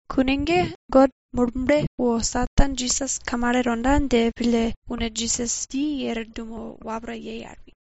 Kune ge God Murble wo Satan Jisas kamale tonda dje pille une Jisas dje i er dumo wapra yei al pi.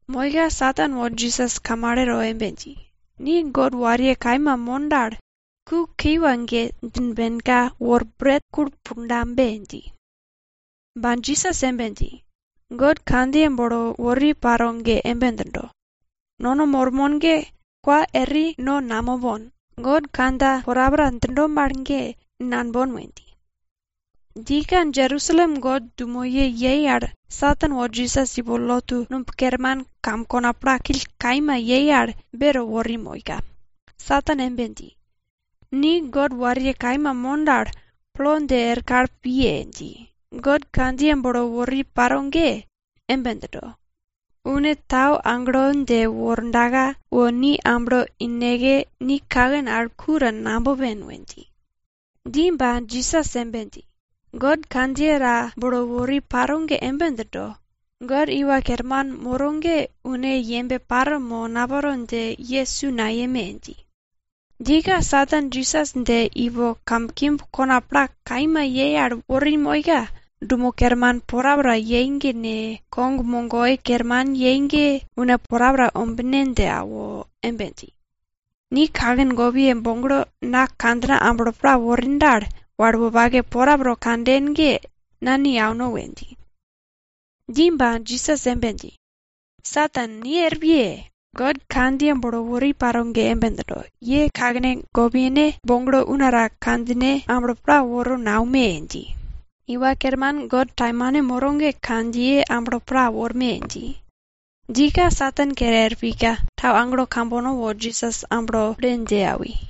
Moika Satan wo Jisas kamale to embe dji, ni God wariye kaima mon dal, ku kiwa ge djimbenka wor bret kulpundabe dji. Ba Jisas embe dji, God kandjiye bolo wori paro ge embe djindo, nono mormon ge kwa eri no namopon, God kandja porapora djindo mal ge nambon we dji. Djika Jerusalem God dumoye yei al Satan wo Jisas ipo lotu numb kerman kam kona plakill kaima yei al beto wori moika Satan embe dji, ni God wariye kaima mon dal, plo dje er kal piye! dji. God kandjiye bolo wori paro ge embe djindo, une tau agelo dje wordaka wo ni amblo ineke, ni kaken al ku ta nabopen we dji. Dji ba, Jisas embe dji, God kandjiye ta bolo wori paro ge embe djindo, God Iwa Kerman moro ge une yembe paro mo naparo ne dje ye su nayeme! dji. Djika Satan Jisas dje ipo kamkimb kona pla kaima yei al wori moika, dumo kerman porapora yei ge ne, kog mogoi kerman yei ge, une porapora ombine dje awo embe dji, ni kaken gopiye boglo na kandjina amblo pla worin dal, wal wopake porapora kanden ge na ni auno we dji. Dji ba, Jisas embe dji, Satan, ni er piye! God kandjiye bolo wori paro ge embe djindo, ye kakene gopyene boglo una ta kandjine amblo pla woro naume! dji. Iwa Kerman God taimane moro ge kandjiye amblo pla worme! dji. Djika Satan kere er pika, tau agelo kambono wo Jisas amblo pille dje awi.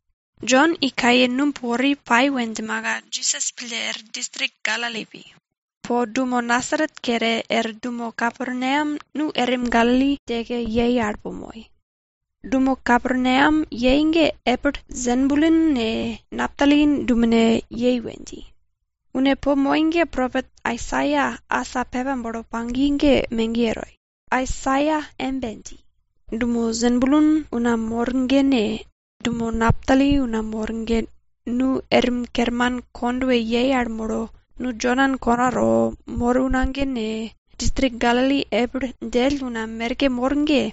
Jon i kaye numb wori pai we djimaka, Jisas pille er distrik Galili pi. Po dumo Nasaret kere, er dumo Kaperneam nu erim Galili djeke yei al po moi. Dumo Kaperneam yei ge epil Sebulun ne, Naptali dumene yei we dji. Une po moi ge propet Aisaia asa pepa bolo pagi ge megiye toi. Aisaia embe dji, Dumo Sebulun una mor ge ne, dumo Naptali una mor ge nu erim kerman kondwe yei al molo, nu Jodan konato mor una ge ne, distrik Galili epil djell una merke mor ge,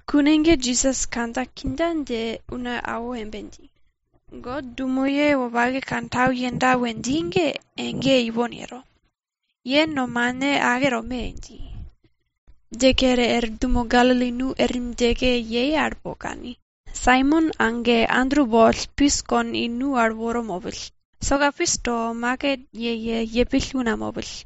Kune ge Jisas kandja kindja dje una awo embe dji, God dumoye wopake kantau yenda we dji ge egeye ipon yero, ye nomane ake tome! dji. Dje kere er dumo Galili nu erim djeke po molo kani, Saimon age Andru boll pis kon i nu al woro mopill. Soka pis to, maket yeye yepill una mopill.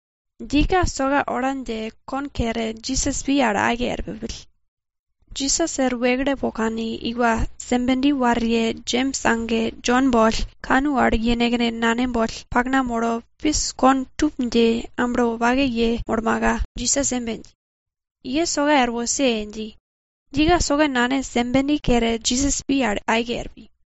Djika soka ola dje kon kere, Jisas pi al aike er pi. Jisas er wekle po kani, iwa Sebedi wariye Jems age Jon boll, kanu al yenekne nane boll pakna molo pis kon tup dji amblo wopake yemolmaka, Jisas embe dji, ye soka er wose! dji. Djika soka nane Sebedi kere, Jisas pi al aike er pi.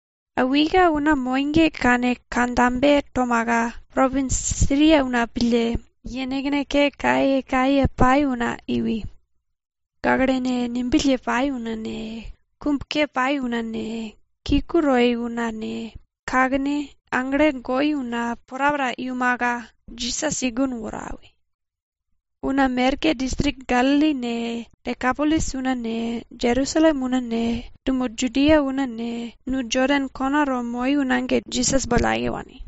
Awika una moi ge kane kandjabe tomaka, propins Siria una pille, yenekne ke kayekaye pai una iwi. Gaklene ngembill ye pai una ne, kum ke pai una ne, kiku toi una ne, kakene aglene goi una porapora iumaka, Jisas i gun woro awi. Una merke distrik Galili ne, Dekapolis una ne, Jerusalem una ne, dumo Judia una ne, nu Jodan konato moi una ge Jisas boll aike wani.